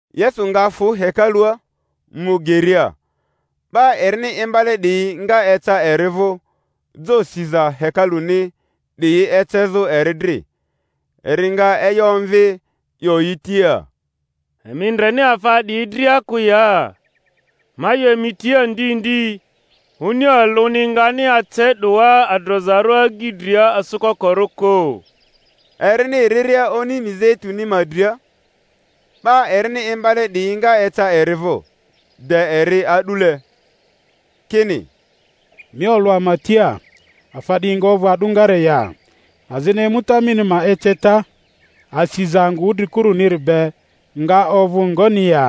Yesu nga fᴜ hekalua, mu geria; 'ba erini imbale 'diyi nga eca eri vᴜ jo siza hekaluni 'diyi ecezᴜ eri dri. Eri nga e'yo omvi, 'yo yi tia, Emi ndreni afa 'diyi dria kᴜ ya? Ma 'yo emi tia ndi ndi, oni alᴜni ngani ace 'doa adrozarᴜ agyi dria asᴜkokorᴜ kᴜ. Erini riria oni Mizeituni ma dria, 'ba erini imbale 'diyi nga eca eri vᴜ de eri a'dule, kini, Mi olᴜ ama tia, afa 'diyi nga ovᴜ a'dᴜngare ya? Azini emuta mini ma eceta, asiza angᴜ wudrikuruniri be, nga ovᴜ ngoni ya?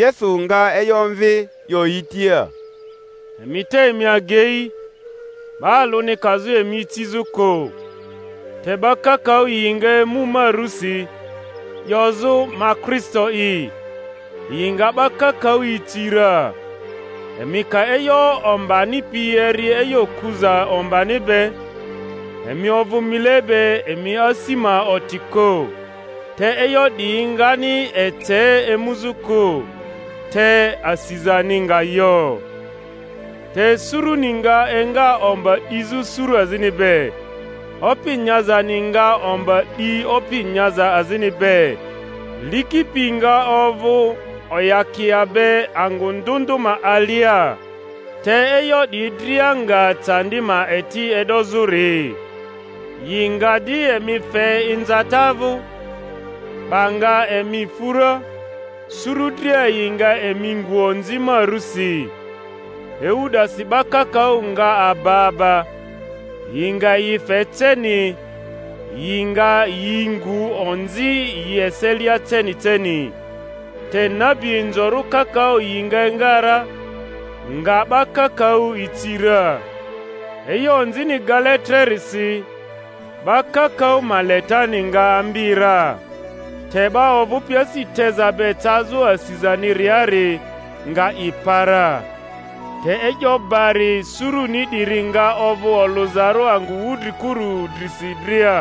Yesu nga e'yo omvi, 'yo yi tia, Emi te emi agei, 'ba alᴜni kazᴜ emi icizᴜ kᴜ. Te 'ba kakaᴜ yi nga emu ma rusi, 'yozᴜ, Ma Kristo'i; yi nga 'ba kakaᴜ ici ra. Emi ka e'yo ombani pi eri e'yo kuza ombani be, emi ovᴜ mile be emi asi ma oti kᴜ, te e'yo 'diyi ngani ece emuzᴜ kᴜ; te asizani nga yo. Te suruni nga enga omba 'dizᴜ suru azini be, opi nyazani nga omba 'di opi nyaza azini be, liki pi nga ovᴜ oyakia be angᴜ ndᴜ ndᴜ ma alia: te e'yo 'diyi dria nga candi ma eti e'dozᴜri. Yi nga di emi fe inzata vᴜ, 'ba nga emi fu ra; suru dria yi nga emi ngu onzi ma rusi. Ewu 'dasi 'ba kakaᴜ nga aba aba, yi nga yi fe ceni, yi nga yi ngu onzi yi eselia ceni ceni. Te nabi inzorᴜ kakaᴜ yi nga enga ra, nga 'ba kakaᴜ ici ra. E'yo onzini gale trerisi, 'ba kakaᴜ ma letani nga ambi ra. Te 'ba ovᴜpi asi teza be cazᴜ asizaniriari nga i pa ra. Te e'yo bari suruni 'diri nga ovᴜ olᴜzarᴜ angᴜ wudrikuru drisi dria,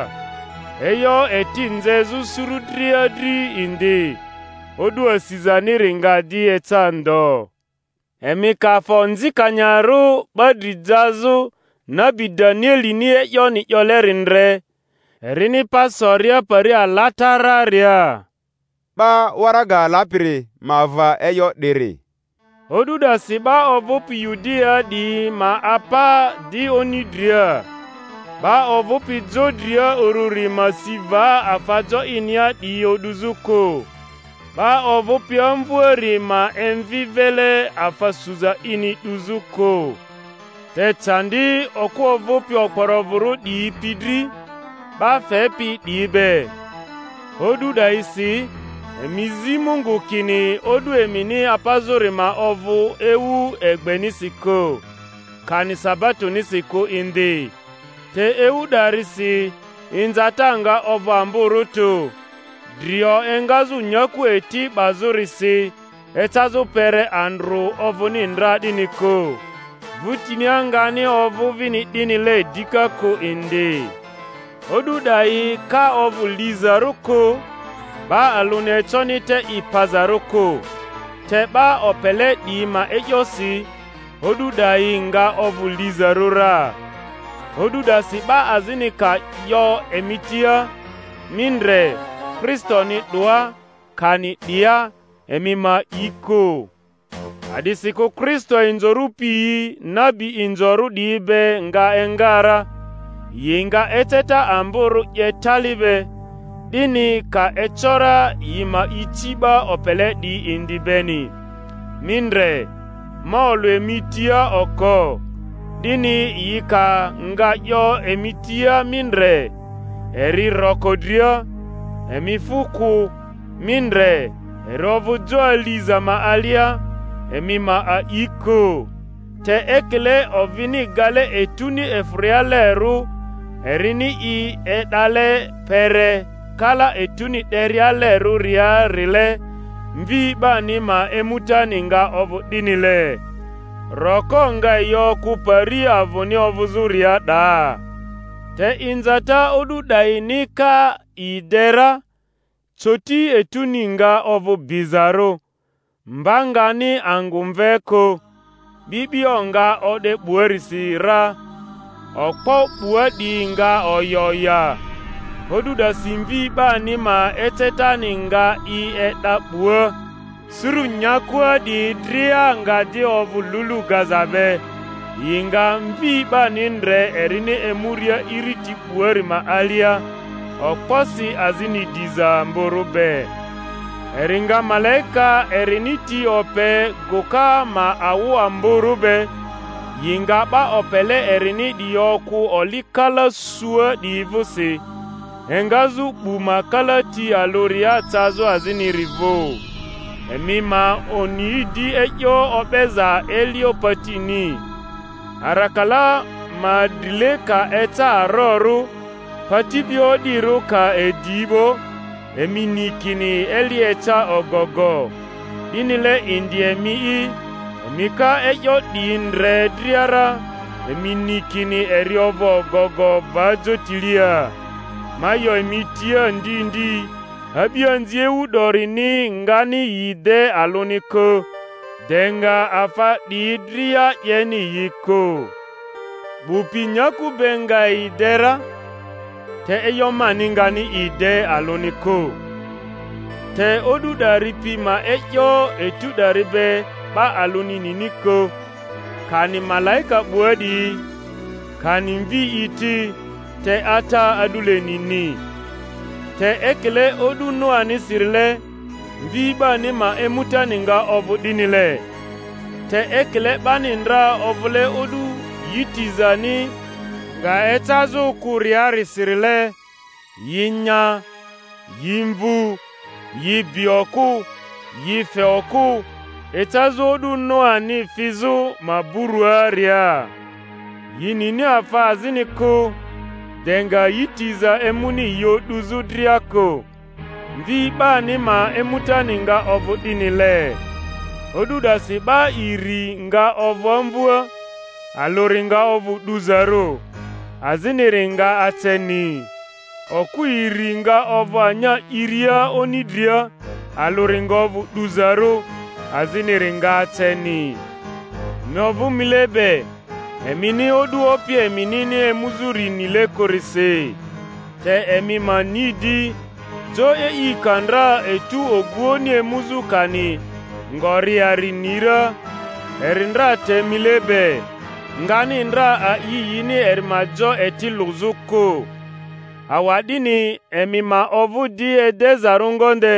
e'yo eti nzezᴜ suru dria dri indi; o'du asizaniri nga di eca ndo. Emi ka afa onzikanyarᴜ 'ba dri jazᴜ, nabi Danielini e'yoni 'yoleri ndre, erini pa soria pari alatararia ('ba waraga lapiri ma va e'yo 'diri), o'du 'dasi 'ba ovᴜpi Yudia 'diyi ma apa di oni dria; 'ba ovᴜpi jo dria ururi ma si va afa jo inia 'diyi o'duzᴜ kᴜ; 'ba ovᴜpi amvᴜari ma emvi vile afa suza ini 'duzᴜ kᴜ. Te candi okᴜ ovᴜpi okporovᴜrᴜ 'diyi pi dri, ba fepi 'diyi be, o'du 'dayisi! Emi zi Mungu kini o'du emini apazᴜri ma ovᴜ ewu egbenisi kᴜ, kani sabatosi kᴜ indi. Te ewu 'darisi inzata nga ovᴜ amborᴜ tᴜ, drio engazᴜ nyaku eti 'bazᴜrisi ecazᴜ kpere andrᴜ ovᴜni ndra 'dini kᴜ, vᴜtinia ngani ovᴜ vini 'dinile dika kᴜ indi. O'du 'dayi ka ovᴜ lizarᴜ kᴜ, 'ba alᴜni econi te i pazarᴜ kᴜ; te 'ba opele 'diyi ma e'yosi, o'du 'dayi nga ovᴜ lizarᴜ ra. O'du 'dasi 'ba azini ka 'yo emi tia, Mi ndre, Kristoni 'doa, kani, 'Dia; emi ma a'i kᴜ. A'disikᴜ Kristo inzorᴜ piyi nabi inzorᴜ 'diyi be nga enga ra, yi nga eceta amborᴜ 'ye tali be, 'dini, ka eco ra, yi ma ici 'ba opele 'diyi indi beni. Mi ndre, ma olᴜ emi tia oko. 'Dini yi ka nga 'yo emi tia, Mi ndre, eri roko dria, emi fᴜ kᴜ; Mi ndre, eri ovᴜ jo aliza ma alia, emi ma a'i kᴜ. Te ekile ovini gale etuni efᴜrialerᴜ, erini i e'dale kpere kala etuni 'derialerᴜriarile, Mvi 'bani ma emutani nga ovᴜ 'dinile. Roko nga yi okᴜ pari avᴜni ovᴜzᴜria 'daa. Te inzata o'du 'dayini ka i de ra, coti etuni nga ovᴜ bizarᴜ, mba ngani angᴜ mve kᴜ, 'bi'bio nga o'de 'buarisi ra, okpo 'bua 'diyi nga oya oya; o'du 'dasi Mvi 'bani ma ecetani nga i e'da 'bua, suru nyakua 'diyi dria nga di ovᴜ lulu gaza be, yi nga Mvi 'bani ndre erini emuria iriti 'buari ma alia, okposi azini diza amborᴜ be; eri nga malaika erini ti ope gᴜka ma awᴜ amborᴜ be, yi nga 'ba opele erini 'diyi okᴜ oli kala sua 'diyi vᴜsi, engazᴜ 'bu ma kalati alᴜria cazᴜ aziniri vᴜ. Emi ma oni di e'yo o'beza elio patini: arakala ma drile ka eca arorᴜ, pati bi o'dirᴜ ka edi 'bo, emi ni kini eli eca ogogo. 'Dinile indi emi'i, emi ka e'yo 'diyi ndre dria ra, emi ni kini eri ovᴜ ogogo, va jotilia. Ma 'yo emi tia ndi ndi, a'bianzi ewu 'dorini ngani yi de alᴜni kᴜ, de nga afa 'diyi dria 'yeni yi kᴜ. 'Bu pi nyaku be nga yi de ra, te e'yo mani ngani i de alᴜni kᴜ. Te o'du 'dari pi ma e'yo etu 'dari be 'ba alᴜni nini kᴜ, kani malaika 'bua 'diyi, kani Mvi'i ti, te Ata a'dule nini. Te ekile o'du Noanisirile, Mvi 'bani ma emutani nga ovᴜ 'dinile. Te ekile 'bani ndra ovᴜle o'du yi tizani nga ecazᴜ kᴜriarisile, yi nya, yi mvᴜ, yi bi okᴜ, yi fe okᴜ, ecazᴜ o'du Noani fizᴜ maburᴜaria, yi nini afa azini kᴜ, de nga yi tiza emuni yi o'duzᴜ dria kᴜ; Mvi 'bani ma emutani nga ovᴜ 'dinile. O'du 'dasi 'ba iri nga ovᴜ amvᴜa; alᴜri nga ovᴜ 'duzarᴜ, aziniri nga aceni. Okᴜ iri nga ovᴜ anya 'iria oni dria; alᴜri nga ovᴜ 'duzarᴜ, aziniri nga aceni. Emi ovᴜ mile be, emini o'du Opi eminini emuzᴜri nile kᴜrisi. Te emi ma ni 'di, jo e'i ka ndra etᴜ oguoᴜni emuzᴜ kani ngoriari ni ra, eri ndra te mile be, ngani ndra a'i yini eri ma jo eti lᴜzᴜ kᴜ. Awa'dini emi ma ovᴜ di edezarᴜ ngonde;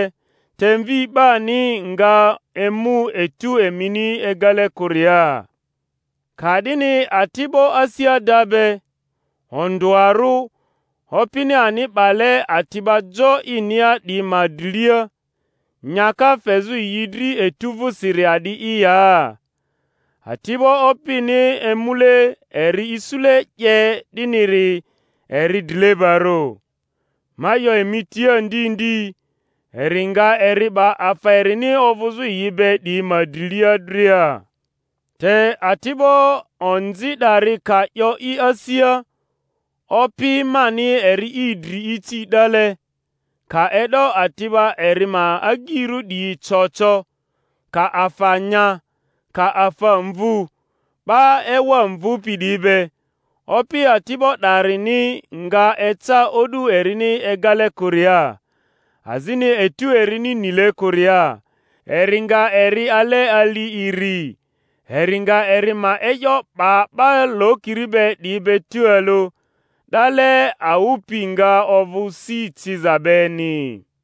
te Mvi 'bani rga emu etu emini egale kᴜria. Ka'dini ati'bo asi ada be, ondᴜarᴜ, opini ani 'bale ati'ba jo inia 'diyi ma drilia, nyaka fezᴜ yi dri etu vᴜsiri a'di'i ya? Ati'bo opini emule eri isule 'ye 'diniri eri drilebarᴜ. Ma 'yo emi tia ndi ndi, eri nga eri 'ba afa erini ovᴜzᴜ yi be 'diyi ma drilia dria. Te ati'bo onzi 'dari ka 'yo i asia, Opi mani eri i dri ici 'dale, ka e'do ati'ba eri ma agyirᴜ 'diyi co co, ka afa nya, ka afa mvu 'ba ewa mvupi 'diyi be, opi ati'bo 'darini nga eca o'du erini egale kᴜria, azini etu erini nile kᴜria, eri nga eri ale ali iri, eri nga eri ma e'yo 'ba 'ba lokiri be 'diyi be tualᴜ; 'dale awᴜ pi nga ovᴜ si ciza beni.